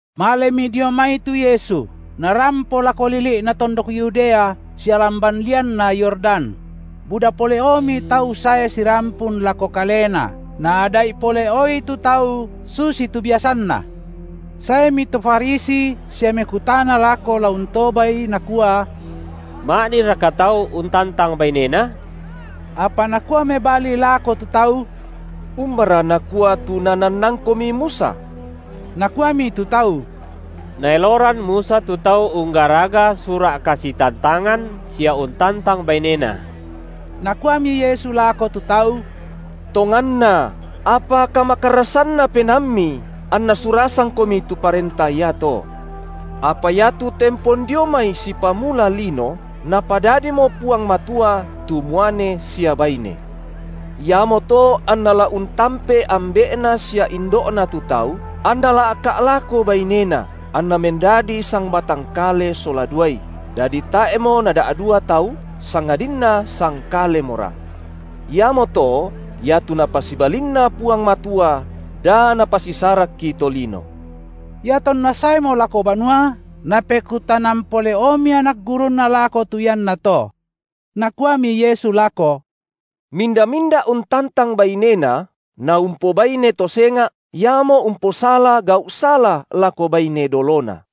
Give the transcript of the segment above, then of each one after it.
Malemi dio mai tu Yesu, Narampo lako lili’na tondok Yudea sia lamban lianna Yordan; buda pole’omi tau sae sirampun lako Kalena, Naada’i pole’oi tu tau susitu biasanNa. Saemi to Farisi sia mekutana lako la untobaI nakua: Ma’dinraka tau untantang bainena? Apa Nakua mebali lako tu tau: Umbara nakua tu nanannangkomi Musa? Nakuami tu tau: Naeloran Musa tu tau unggaraga sura’ kasitantangan, sia untantang bainena. Nakuami Yesu lako tu tau: Tonganna, apa kamakarrasanna penaammi, anna surasangkomi tu parenta iato. Apa iatu tempon dio mai sipamula lino, Napadadimo Puang Matua tu muane sia baine. Iamoto anna la untampe ambe’na sia indo’na tu tau, anna la’ka’ lako bainena, anna mendadi sangbatang kale sola duai, dadi tae’mo nada’dua tau, sangadinna sangkalemora. Iamoto, iatu Napasibalinna Puang Matua, da napasisarakki tolino. Iatonna saemo lako banua, napekutanan pole’omi anak gurunNa lako tu iannato. Nakuami Yesu lako: Minda-minda untantang bainena, naumpobaine to senga’, iamo umposala gau’ sala lako baine dolona.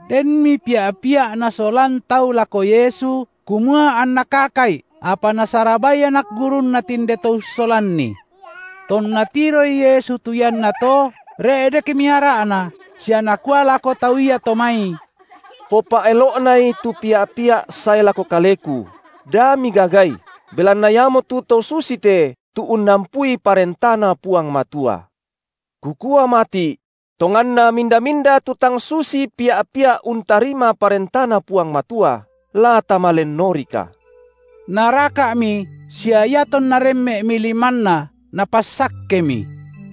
Denmi pia’-pia’ nasolan tau lako Yesu, kumua anNa kaka’i, apa nasarabai anak gurunNa tinde to ussolanni. Tonna tiroi Yesu tu iannato, re’dekmi ara’Na sia Nakua lako tau iato mai: Popa’elo’nai tu pia’-pia’ sae lako Kaleku, da migagai, belanna iamotu to susite tu unnampui ParentaNa Puang Matua. Kukua mati’: Tonganna minda-minda tu tang susi pia’-pia’ untarima ParentaNa Puang Matua, la tama lennorika! Naraka’mi, sia iatonNa remme’mi limanNa Napassakkemi.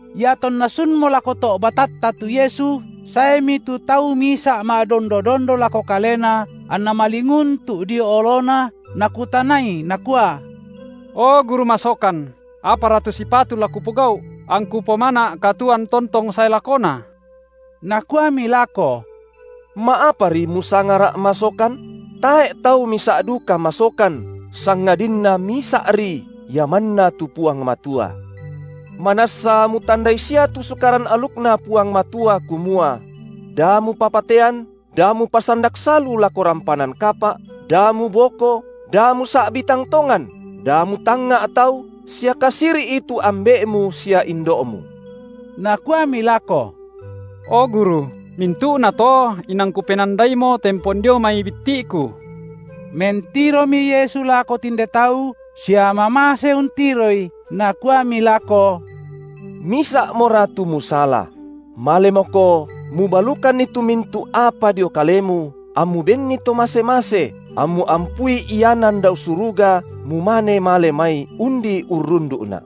IatonNa sunmo lako to’ batatta tu Yesu, saemi tu tau misa’ ma’dondo-dondo lako Kalena anna malinguntu’ dio oloNa, nakutanai nakua: O Guru masokan, apara tu sipatu la kupogau’, angku pomana’ katuoan tontong sae lakona? Nakuami lako: Ma’apari musangaRa’ masokan? Tae’ tau misa’ duka masokan, sangadinna Misa’ri, Ia manna tu Puang Matua. Manassa mutandai sia tu Sukaran alukNa Puang Matua kumua: Da mupapatean, Da mupasandak salu lako rampanan kapa’, Da muboko, Da musa’bi tang tongan, Da mutangnga’ tau, sia kasiri’i tu ambe’mu sia indo’mu. Nakuami lako: O Guru, mintu’nato inang kupenandaimo tempon dio mai bitti’ku. Mentiromi Yesu lako tinde tau, sia mamase untiroi, Nakuami lako: Misa’mora tu musala: Malemoko, mubalukanni tu mintu’ apa dio kalemu ammu benni to mase-mase, ammu ampui ianan dao suruga mumane male mai, undi urrundu’Na’.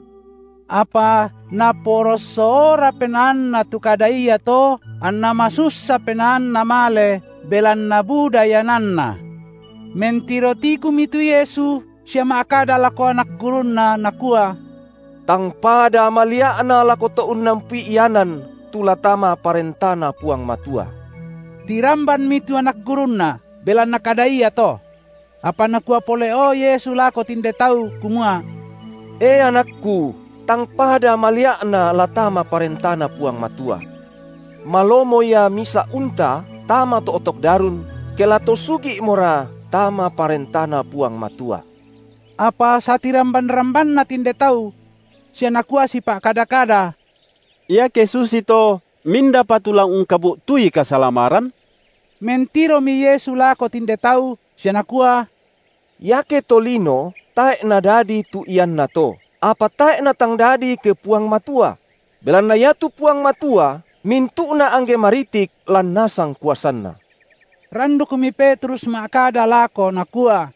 Apa naporossoora penaanna tu kada iato, anna masussa penaanna male, belanna buda iananna. Mentiro tikumi tu Yesu, sia ma’kada lako anak gurunNa, Nakua: Tangpada malia’na lako to unnampui ianan tu la tama ParentaNa Puang Matua! Tirambanmi tu anak gurunNa belanna kada iato. Apa Nakua pole’o Yesu lako tinde tau kumua: E anakKu, tangpada malia’na la tama ParentaNa Puang Matua. Malomo ia misa’ unta tama to’tok darun ke la to sugi’mora tama ParentaNa Puang Matua. Apa satiramban-rambanna tinde tau sia nakua sipa’kada-kada: Iake susito, mindapa tu la ungkabu’tui kasalamaran? Mentiromi Yesu lako tinde tau sia Nakua: Iake tolino tae’ nadadi tu iannato, apa tae’ natang dadi ke Puang Matua; belanna iatu Puang Matua mintu’na angge maritik lan nasang kuasanNa. Randukmi Petrus ma’kada lako nakua: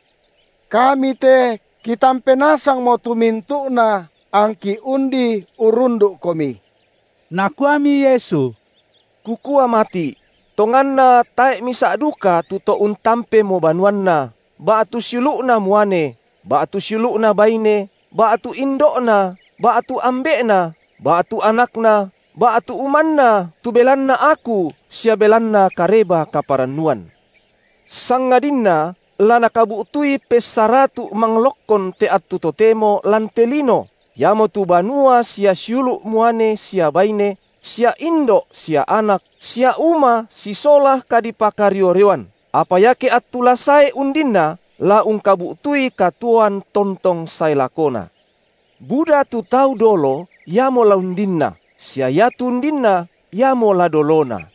Kami te kitampe nasangmmo tu mintu’na angki undi urrundu’Komi. Nakuami Yesu: Kukua mati’: tonganna tae’ misa’ duka tu to untampemo banuanna, ba’tu siulu’na muane, ba’tu siulu’na baine, ba’tu indo’na, ba’tu ambe’na, ba’tu anakna, ba’tu umanna tu belanna Aku sia belanna Kareba-kaparannuan, sangadinna la nakabu’tui pessaratu’ manglokkon te attu totemo lan te lino iamotu banua sia siulu’ muane sia baine, sia indo’ sia anak, sia uma sisola kadipakario-rioan, apa iake attu la sae undinna la ungkabu’tui katuoan tontong sae lakona. Buda tu tau dolo iamo la undinna, sia iatu undinna iamo la dolona.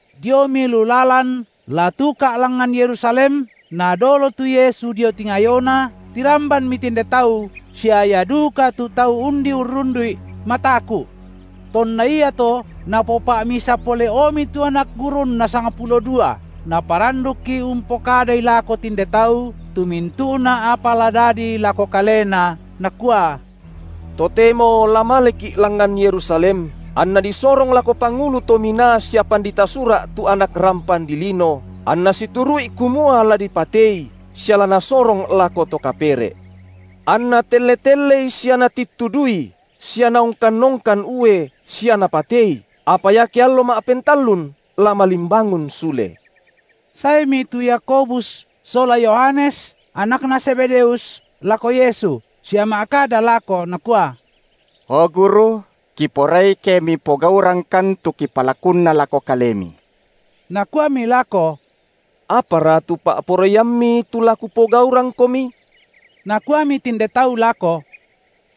Diomi lu lalan la tuka’ langngan Yerusalem, Nadolo tu Yesu dio tingayona, tirambanmi tinde tau, sia ia duka tu tau undi urrundu’I mataku’. Tonna iato Napopa’misa pole’omi tu anak gurunNa sangpulo dua, Naparandukki umpokadai lako tinde tau tu mintu’na apa la dadi lako Kalena, Nakua: Totemo la maleki’ langngan Yerusalem, anNa disorong lako pangulu to minaa sia pandita Sura’ tu Anak rampan dilino, anna situru’i kumua la dipateI, sia la nasorong lako to kapere’. Anna telle-telleI sia natittuduI, sia naongkan-ongkan ue sia napateI, apa iake allo ma’pentallun la malimbangun sule. Saemi tu Yakobus sola Yohanes, anakna Zebedeus lako Yesu sia ma’kada lako nakua: O Guru, kiporai ke Mipogaurangkan tu kipalakunna lako Kalemi. Nakuami lako: Apara tu pa’poraiam- mi tu la Kupogaurangkomi. Nakuami tinde tau lako: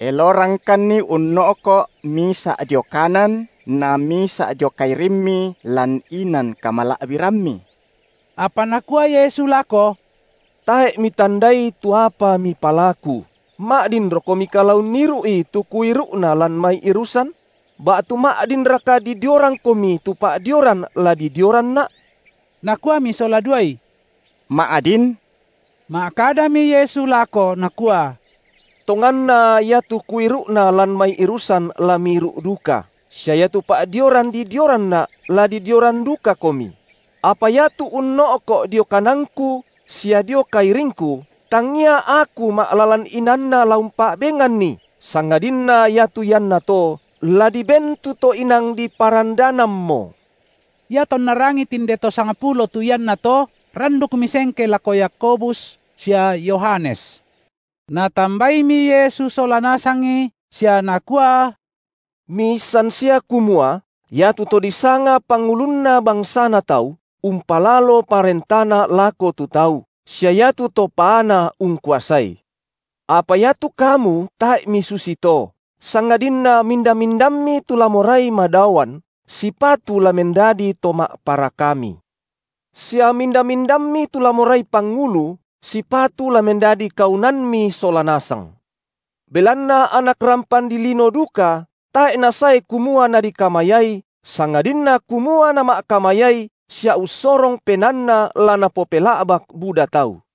Elorangkanni unno’ko’ misa’ dio kanan na misa’ dio kairimMi lan inan kamala’biramMi. Apa Nakua Yesu lako: Tae’ mitandai tu apa mipalaku. Ma’dinrokomika la unniru’i tu Kuiru’na lan mai irusan? Ba’tu ma’dinraka didiorangkomi tu pa’dioran la didioranNa? Nakuami sola duai: Ma’din. Ma’kadami Yesu lako nakua: Tonganna iatu Kuiru’na lan mai irusan la miiru’duka, sia iatu pa’dioran didioranNa’ la didioran dukakomi; apa iatu unno’ko’ dio kananKu sia dio kairingKu tangia Aku ma’lalan inaanNa la umpa’benganni, sangadinna iatu iannato la diben tu to inang diparandanammo. Iatonna rangii tinde to sangpulo tu iannato, randukmi sengke lako Yakobus sia Yohanes. Natambaimi Yesu sola nasangi sia Nakua: Miissan sia kumua iatu to disanga pangulunna bangsana tau, umpalalo parentana lako tu tau, sia iatu to paana ungkuasai. Apa iatu kamu tae’ misusito, sangadinna minda-mindammi tu la morai madaoan, sipatu la mendadi to ma’parakami. Sia minda-mindammi tu la morai pangulu, sipatu la mendadi kaunanmi sola nasang. Belanna Anak rampan dilino duka tae’ Nasae kumua Nadikamayai sangadinna kumua Nama’kamayai sia ussorong penaanNa la napopela’bak buda tau.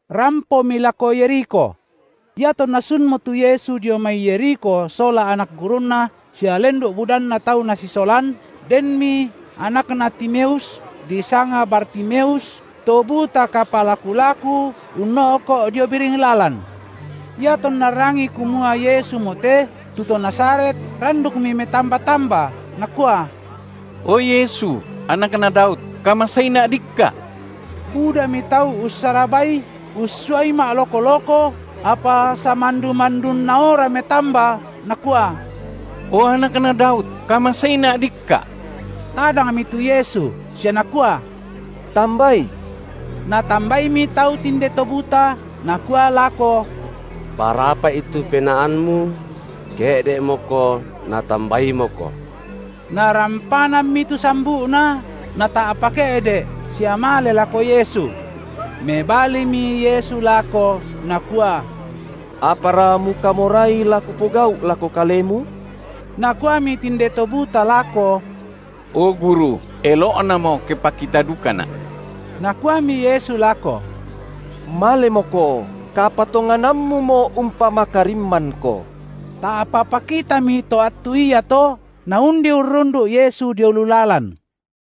Rampomi lako Yerikho. Iatonna sunmo tu Yesu dio mai Yerikho sola anak gurunNa sia lendu’ budanna tau Nasisolan, denmi anakna Timeus, disanga Bartimeus, to buta kapalaku-laku, unno’ko’ dio biring lalan. Iatonna rangii kumua Yesumo te, tu to Nazaret, randukmi metamba-tamba, nakua: o Yesu, Anakna Daud kamaseina’ dikka’. Budami tau ussarabai, ussuai ma’- loko-loko, apa samandu-mandunaora metamba, nakua: O Anakna Daud, kamaseina’ dikka’! Tadangmi tu Yesu sia Nakua: Tambai. Natambaimi tau tinde to buta, nakua lako: Parapa’i tu penaammu; ke’de’moko, Natambaimoko. Narampanammi tu sambu’na, nata’pa ke’de’ sia male lako Yesu. Mebalimi Yesu lako, Nakua: Apara mukamorai la Kupogau’ lako kalemu? Nakuami tinde to buta lako: O Guru, elo’namo ke pakita dukana’. Nakuami Yesu lako: Malemoko, kapatonganammumo umpamakarimmanko. Ta’pa pakitami to attu iato, naundi urrundu’ Yesu dio lu lalan.